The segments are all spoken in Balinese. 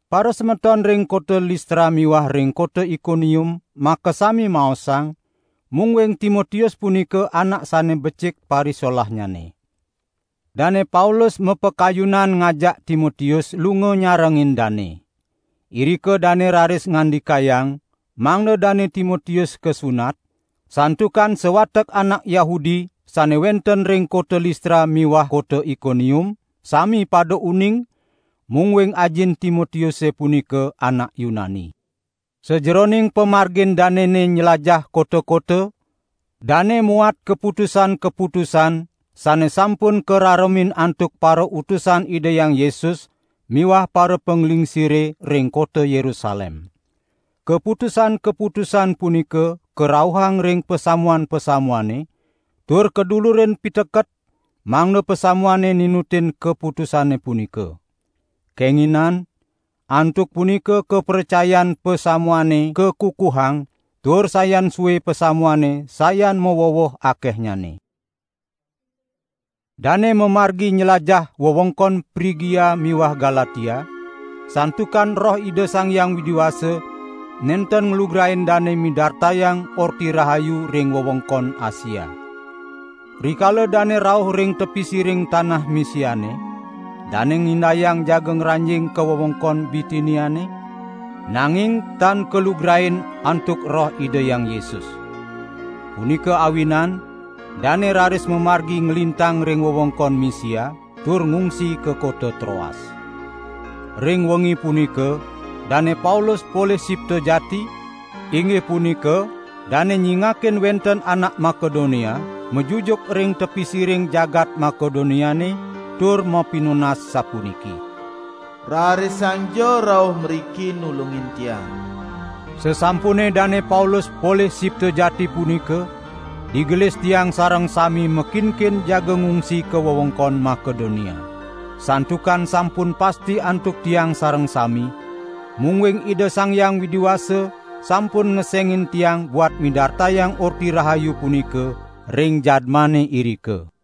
Parasemeton ring kota Listra miwah ring kota Ikonium makasami maosang, mungguing Timotius punika anak sane becik parisolahnyane. Dane Paulus mapakayunan ngajak Timotius lunga nyarengin dane. Irika dane raris ngandikayang mangda Dane Timotius kasunat, santukan sawatek anak Yahudi sane wenten ring kota Listra miwah kota Ikonium sami pada uning, mungguing ajin Timotiuse punika anak Yunani. Sajeroning pamargin danene nylajah kota-kota, dane muat kaputusan-kaputusan sane sampun kararemin antuk parautusan Ida Hyang Yesus miwah parapanglingsire ring kota Yerusalem. Kaputusan-kaputusan punika karauhang ring pasamuan-pasamuane, tur kadulurin piteket mangda pasamuane ninutin kaputusane punika. Kenginan antuk punika kapracayan pasamuane kakukuhang tur sayan sue pasamuane sayan maweweh akehnyane. Dane mamargi nylajah wewengkon Prigia miwah Galatia, santukan Roh Ida Sang Hyang Widi Wasa nenten nglugrain dane midartayang Orti Rahayu ring wewengkon Asia. Rikala dane rauh ring tepi siring tanah Misiane, dane ngindayang jaga ngranjing ka wewengkon Bitiniane, nanging tan kalugrain antuk Roh Ida Hyang Yesus. Punika awinan dane raris mamargi nglintang ring wewengkon Misia tur ngungsi ka kota Troas. Ring wengi punika Dane Paulus polih sipta jati, inggih punika dane nyingakin wenten anak Makedonia, majujuk ring tepi siring jagat Makedoniane tur mapinunas sapuniki: "Rarisangja rauh mriki nulungin tiang!" Sasampune Dane Paulus polih sipta jati punika, digelis tiang sareng sami makinkin jaga ngungsi ka wewengkon Makedonia. Santukan sampun pasti antuk tiang sareng sami, mungguing Ida Sang Hyang Widi Wasa sampun ngesengin tiang buat midartayang Orti Rahayu punika ring jadmane irika.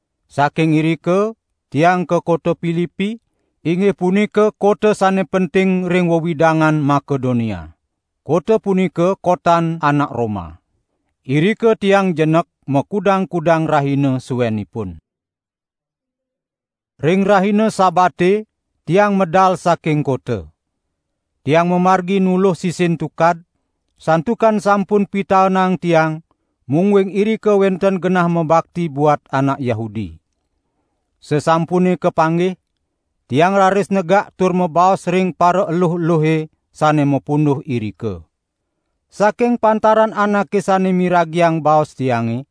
Saking irika tiang ka kota Pilipi, inggih punika kota sane penting ring wewidangan Makedonia. Kota punika kotan anak Roma. Irika tiang jenek makudang-kudang rahina suenipun. Ring rahina Sabate tiang medal saking kota. Tiang mamargi nuluh sisin tukad, santukan sampun pitaenang tiang mungguing irika wenten genah mabakti buat anak Yahudi. Sasampune kapanggih, tiang raris negak tur mabaos ring paraeluh-eluhe sane mapunduh irika. Saking pantaran anake sane miragiang baos tiange,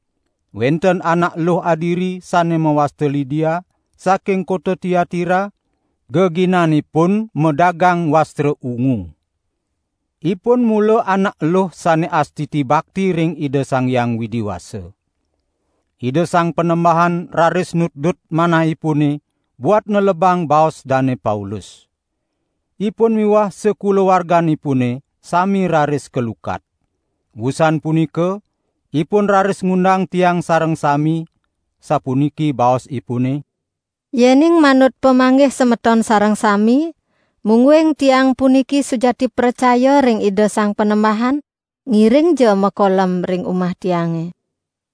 wenten anak eluh adiri sane mawasta Lidia, saking kota Tiatira, geginanipune madagang wastra ungu. Ipun mula anak eluh sane astiti bakti ring Ida Sang Hyang Widi Wasa. Ida Sang Panembahan raris nutdut manahipune buat nelebang baos Dane Paulus. Ipun miwah sakulawarganipune sami raris kalukat. Wusan punika ipun raris ngundang tiang sareng sami, sapuniki baosipune: "Yening manut pamanggih semeton sareng sami, mungguing tiang puniki sujati pracaya ring Ida Sang Panembahan, ngiringja makolem ring umah tiange!"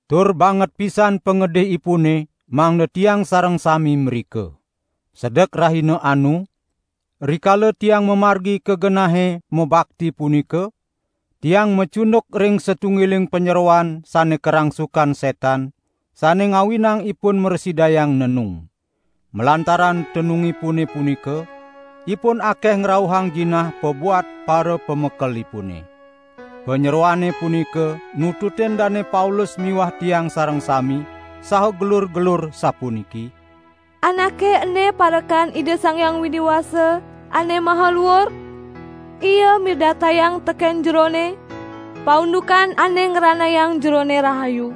Tur banget pisan pangedihipune mangda tiang sareng sami mrika. Sedek rahina anu, rikala tiang mamargi ka genahe mabakti punika, tiang macunduk ring satunggiling panyeroan sane karangsukan setan sane ngawinang ipun mrasidayang nenung. Malantaran tenungipune punika, ipun akeh ngrauhang jinah pabuat parapamekelipune. Panyeroane punika nututin Dane Paulus miwah tiang sareng sami saha gelur-gelur sapuniki: "Anake ene parekan Ida Sang Hyang Widi Wasa Ane Maha Luur! Ia midartayang teken jerone, paundukan ane ngranayang jerone rahayu."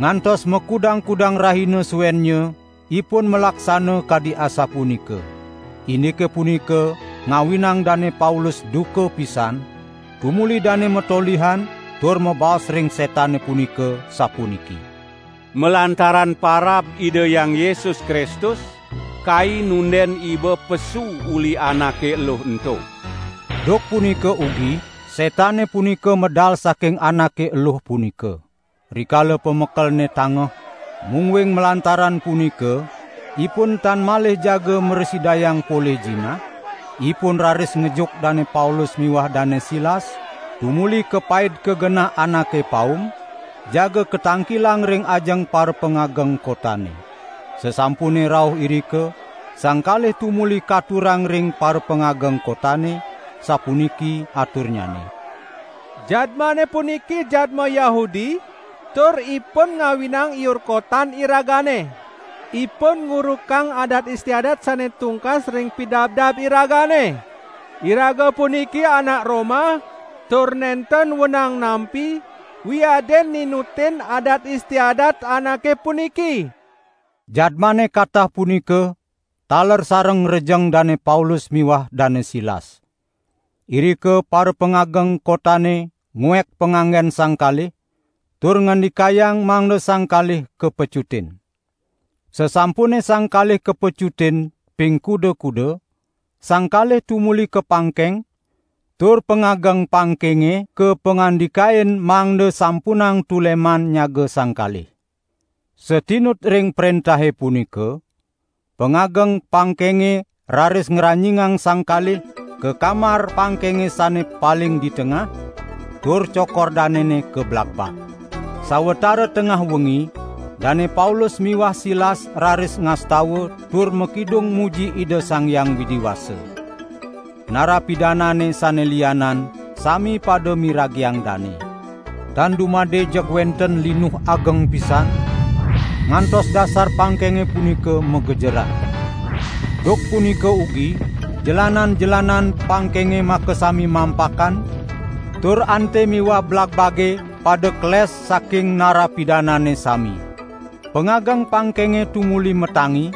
Ngantos makudang-kudang rahina suennya ipun malaksana kadi asapunika. Indike punika ngawinang Dane Paulus duka pisan, tumuli dane matolihan tur mabaos ring setane punika, sapuniki: "Malantaran parab Ida Hyang Yesus Kristus, kai nunden iba pesu uli anake eluh ento!" Duk punika ugi setane punika medal saking anake eluh punika. Rikala parapamekelne tangeh, mungguing malantaran punika ipun tan malih jagi mrasidayang polih jinah, ipun raris ngejuk Dane Paulus miwah Dane Silas, tumuli kapaid ka genah anake paum, jaga katangkilang ring ajeng parapangageng kotane. Sasampune rauh irika, sang kalih tumuli katurang ring parapangageng kotane, sapuniki aturnyane: "Jadmane puniki jadma Yahudi tur ipun ngawinang iur kotan iragane. Ipun ngurukang adat istiadat sane tungkas ring pidabdab iragane. Iraga puniki anak Roma, tur nenten wenang nampi wiadin ninutin adat istiadat anake puniki." Jadmane katah punika taler sareng ngrejeng Dane Paulus miwah Dane Silas. Irika parapangageng kotane nguek panganggen sang kalih, tur ngandikayang mangda sang kalih kapecutin. Sasampune sang kalih kapecutin ping kuda-kuda, sang kalih tumuli kapangkeng tur pangageng pangkenge kapangandikain mangda sampunang tuleman nyaga sang kalih. Satinut ring prentahe punika, pangageng pangkenge raris ngranjingang sang kalih ka kamar pangkenge sane paling di tengah, tur cokor danene kablagbag. Sawatara tengah wengi Dane Paulus miwah Silas raris ngastawa tur makidung muji Ida Sang Hyang Widi Wasa. Nara pidanane sane lianan sami pada miragiang dane. Tan dumade jeg wenten linuh ageng pisan, ngantos dasar pangkenge punika magejeran. Duk punika ugi jelanan-jelanan pangkenge makasami mampakan, tur ante miwah blagbage pada keles saking nara pidanane sami. Pangageng pangkenge tumuli matangi,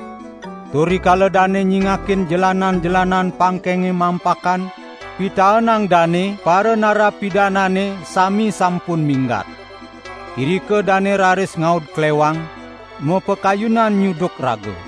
tur rikala dane nyingakin jelanan-jelanan pangkenge mampakan, pitaenang dane paranara pidanane sami sampun minggat. Irika dane raris ngaud klewang, mapakayunan nyuduk raga.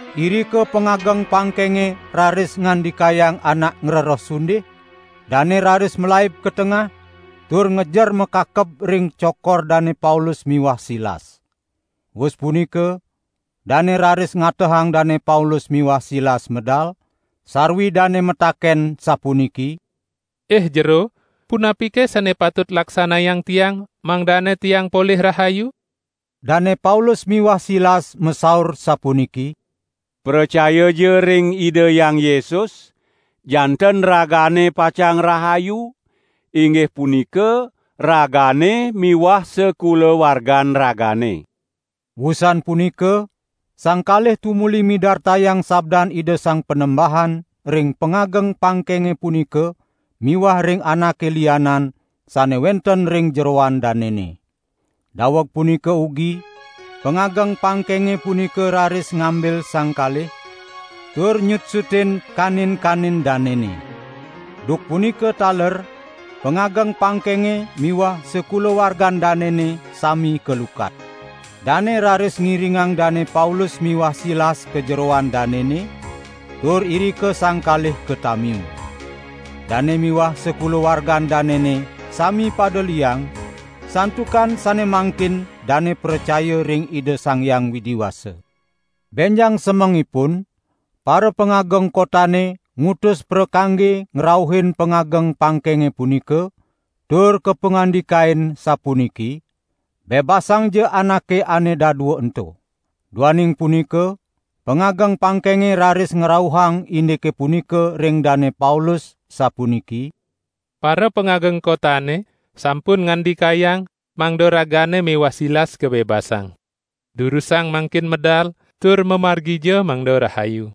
Irika pangageng pangkenge raris ngandikayang anak ngrereh sundih, dane raris malaib ka tengah tur ngejer makakeb ring cokor Dane Paulus miwah Silas. Wus punika dane raris ngatehang Dane Paulus miwah Silas medal, sarwi dane mataken sapuniki: "Ih jero, punapike sane patut laksanayang tiang, mangdane tiang polih rahayu?" Dane Paulus miwah Silas masaur sapuniki: "Pracayaja ring Ida Hyang Yesus, janten ragane pacang rahayu, inggih punika ragane miwah sakulawargan ragane." Wusan punika sang kalih tumuli midartayang sabdan Ida Sang Panembahan ring pangageng pangkenge punika miwah ring anake lianan sane wenten ring jeroan danene. Daweg punika ugi pangageng pangkenge punika raris ngambil sang kalih, tur nyutsutin kanin-kanin danene. Duk punika taler pangageng pangkenge miwah sakulawargan danene sami kalukat. Dane raris ngiringang Dane Paulus miwah Silas ka jeroan danene, tur irika sang kalih katamiu. Dane miwah sakulawargan danene sami pada liang, santukan sane mangkin dane pracaya ring Ida Sang Hyang Widi Wasa. Benjang semengipun parapangageng kotane ngutus prakangge ngrauhin pangageng pangkenge punika tur kapangandikain sapuniki: "Bebasangja anake ane dadua ento!" Duaning punika pangageng pangkenge raris ngrauhang indike punika ring Dane Paulus, sapuniki: "Parapangageng kotane sampun ngandikayang mangda ragane miwah Silas kabebasang. Durusang mangkin medal, tur mamargija mangda rahayu."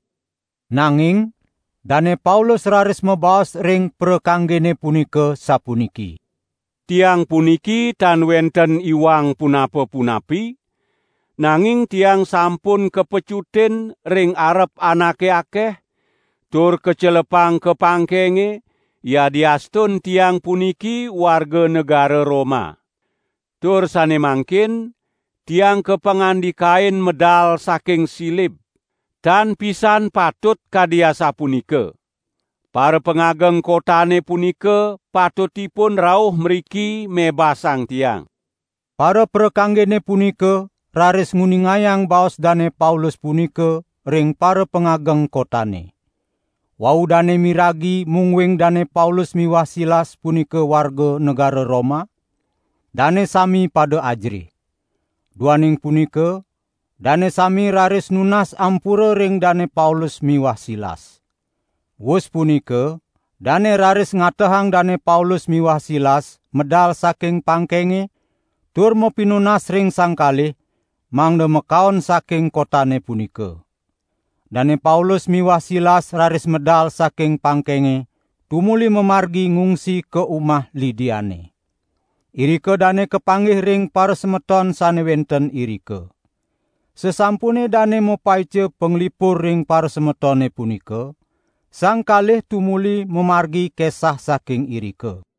Nanging Dane Paulus raris mabaos ring prakanggene punika sapuniki: "Tiang puniki tan wenten iwang punapa-punapi; nanging tiang sampun kapecutin ring arep anake akeh, tur kacelepang ka pangkenge, yadiastun tiang puniki warga negara Roma! Tur sane mangkin tiang kapangandikain medal saking silib! Tan pisan patut kadi asapunika. Parapangageng kotane punika patutipun rauh mriki mebasang tiang." Paraprakanggene punika raris nguningayang baos Dane Paulus punika ring parapangageng kotane. Wau dane miragi mungguing Dane Paulus miwah Silas punika warga negara Roma, dane sami pada ajerih. Duaning punika dane sami raris nunas ampura ring Dane Paulus miwah Silas. Wus punika dane raris ngatehang Dane Paulus miwah Silas medal saking pangkenge, tur mapinunas ring sang kalih mangda makaon saking kotane punika. Dane Paulus miwah Silas raris medal saking pangkenge tumuli mamargi ngungsi ka umah Lidiane. Irika dane kapanggih ring parasemeton sane wenten irika. Sasampune dane mapaica panglipur ring parasemetone punika, sang kalih tumuli mamargi kesah saking irika.